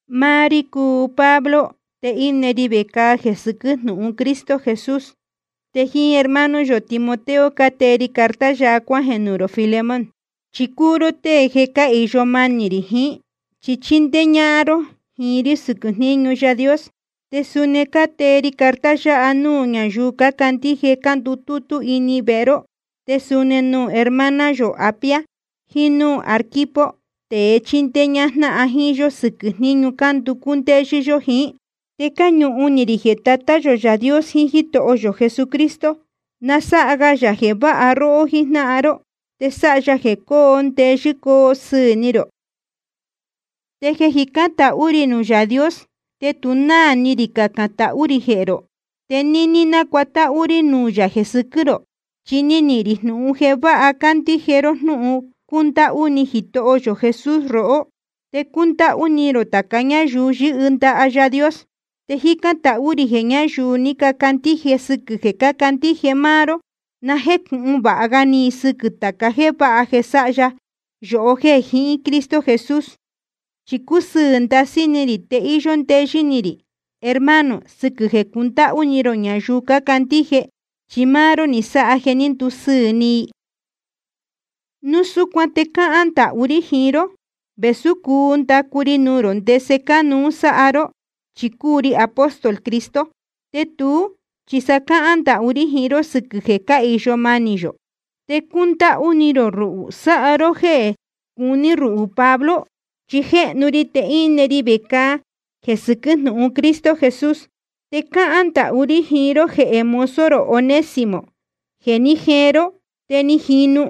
Máá rí cúu Pablo, te íne ri vecāa jeē sɨquɨ́ jnúhun Cristo Jesús. Te jíín hermano yō Timoteo cátee ri carta yáha cuájeē nuū rō Filemón. Chi cúu ró tée jeē cáhīyo manī rī jiín, chi chíndéé ñájnáhan ró jíín rí sɨquɨ̄ jníñu Yaā Dios. Te suni cátee ri carta yáha nuū ñáyuu cácandíje cándutútú ini vehe ró, te suni nuū hermana yō Apia, jiín núū Arquipo, tēe chíndéé ñájnáhan jíín yó sɨquɨ̄ jníñu cánducú ndéyɨ́ yó jiín. Te cáñuhun ni rī jeē Tatá yō Yaā Dios jiín Jítoho yō Jesucristo, na sáha ga yā jeē váha róhó jíjnáhan ró, te sáha ya jeē coo ndeyɨ́ coo sɨɨ̄ ni rō. Te jeē jicán tahú rī nuū Yaā Dios te tu náā ni rī cacān tahú rī jehē rō, te níní nácuatáhú rí nuū yā jeē sɨquɨ́ rō. Chi níhín rī jnūhun jeē váha cándíje ró jnúhun cúndáhú ni Jitoho yō Jesús rohó, te cúndáhú ni rō tāca ñáyuu yɨ́hɨ ndaha Yaā Dios. Te jícán tahú rī jeē ñáyuu ni cacandíje sɨquɨ̄ jeē candíje máá ró, na jécūhun vāha ga ni i sɨquɨ̄ tāca jéē váha jeē sáha ya yohó jeē jiín Cristo Jesús. Chi cúsɨɨ̄ ndasɨ́ ni rī te íyó ndeyɨ́ ni rī, hermano, sɨquɨ̄ jeē cundáhú ni rō ñayuu cácandíje. Chi máá ró ni sáha jeē ní ndusɨɨ̄ ni i. Núu súcuan te cáhán ndahú rí jiín ró, vēsú cuu ndacu ri nuū rō ndese cánuú sáha ró, chi cúu ri apóstol Cristo. Te tuú chi sa cáhán ndahú rí jiín ró sɨquɨ̄ jeē cáhīyo manī yō. Te cundáhú ni rō ruhū sáha ró jéē cuní ruhū Pablo, chi je jéhnu ri, te íne ri vecāa jeē sɨquɨ́ jnúhun Cristo Jesús. Te cáhán ndahú rí jiín ró jehē mozo rō Onésimo jeē ní jeen ró te ni jinu.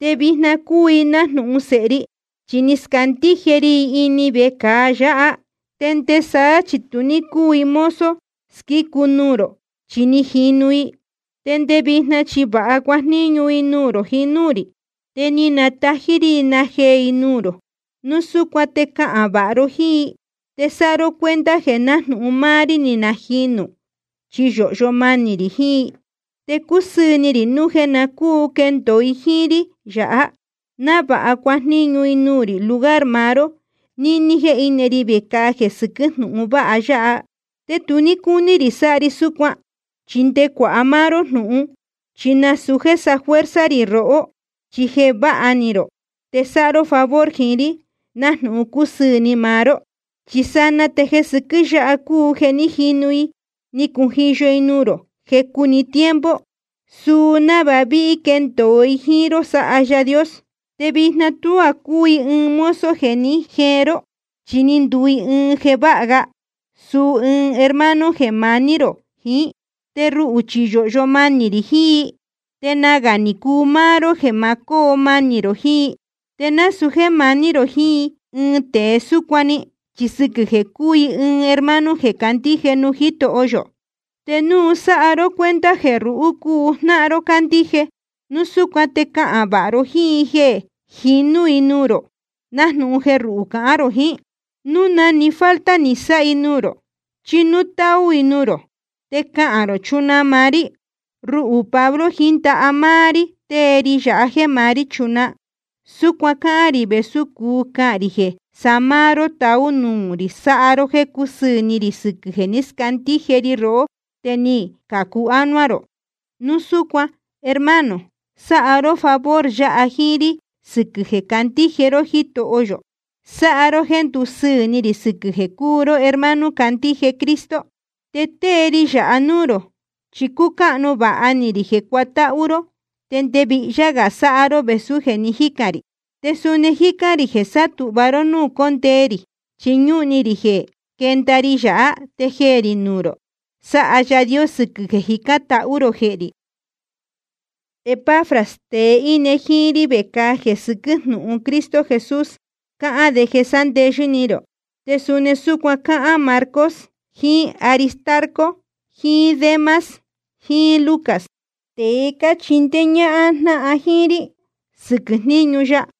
Te vijna te cúu i nájnūhun sēhe ri, chi ni scándíje ri i ini vecāa yāhá. Te nde saá chi tu ní cúu i mozo squícu nuū rō, chi ni jinu i. Te nde vijna chi vāha cuajníñu i nuū rō jiín núū rī. Te nátají rí i najeē i nuū rō. Núu súcuan te cahān vāha ró jíín i, te sáha ró cuenta jeē nájnūhun máá rí ni najinū, chi yōhyo manī rī jiín i. Te cusɨɨ̄ ni rī núu jeē na cúu quendōo i jíín rí yāhá, návāha cuajníñu i nuū rī lugar maá ró níní jéē íne ri vecāa jeē sɨquɨ́ jnúhun vāha ya. Te tu ní cúní rī sáha ri súcuan, chi nde cuāha máá ró jnūhun. Chi nasūu jéē safuerza rī rohó, chi jeē váha ni rō te sáha ró favor jiín rí, nájnūhun cúsɨɨ̄ ni maá ró. Chi sanaa te jeē sɨquɨ́ yáha cúu jeē ní jinu i ni cujiyo i nuū rō jecu‑ni tiempo, suu návāha ví quendōo i jíín ró sáha Yaā Dios. Te vijna tuá cúu i ɨɨn mozo jeē ní jeen ró, chi ni nduu i ɨɨn jeē váha ga, suu ɨɨn hermano jeē maní rō jiín. Te ruhū chi yōhyo manī rī jiín i, te nagā ni cuu máá ró jeē ma cóo manī rō jiín i. Te nasūu jéē maní rō jiín ɨɨn tēe súcuan‑ni, chi sɨquɨ̄ jeē cúu i ɨɨn hermano jeē candíje nuū Jítoho yō. Te núu sáha ró cuenta jeē ruhū cúu jnáhan ró cándíje, núu súcuan te cahān vāha ró jíín i jeē jinú i nuū rō, nájnūhun jeē ruhū cahān rō jiín. Núu na‑ni falta ni sáha i nuū rō, chí núu táú i nuū rō, te cacān rō chunaa maá rí. Ruhū Pablo, jíín ndaha máá rí tée ri yāha jéē maá rí nachunaa. Súcuan cáhán rī vēsú cuu cahān rī jeē sa máá ró taú nuū rī sáha ró jéē cúsɨɨ̄ ni rī sɨquɨ̄ jeē ni scándíje ri rohó te ni cācu ánuá rō. Núu súcuan, hermano, sáha ró favor yáha jíín rí sɨquɨ̄ jeē candíje ró Jítoho yō. Sáha ró jéē ndúsɨɨ̄ ni rī, sɨquɨ̄ jeē cúu ró hermano candíje Cristo. Te tée ri yáha núū rō, chi cúcáhnu vāha ni rī jeē cuatáhú ró, te nde vihyá gā sáha ró vēsú jeē ni jícān rī. Te suni jícán rī jeē sátūhva ró núū cóndee rī, chi ñúhun ni rī jeē quénda ri yāhá te jeē rī nuū rō sáha Yaā Dios sɨquɨ̄ jeē cájicān tahú rō jehē rī. Epafras, tēe íne jíín rí vecāa jeē sɨquɨ́ jnúhun Cristo Jesús, cáhán de jeē sándeyɨ́ ni rō. Te suni súcuan cácahān Marcos, jiín Aristarco, jiín Demas, jiín Lucas, tēe cáchindéé ñájnáhan jíín rí sɨquɨ̄ jníñu ya.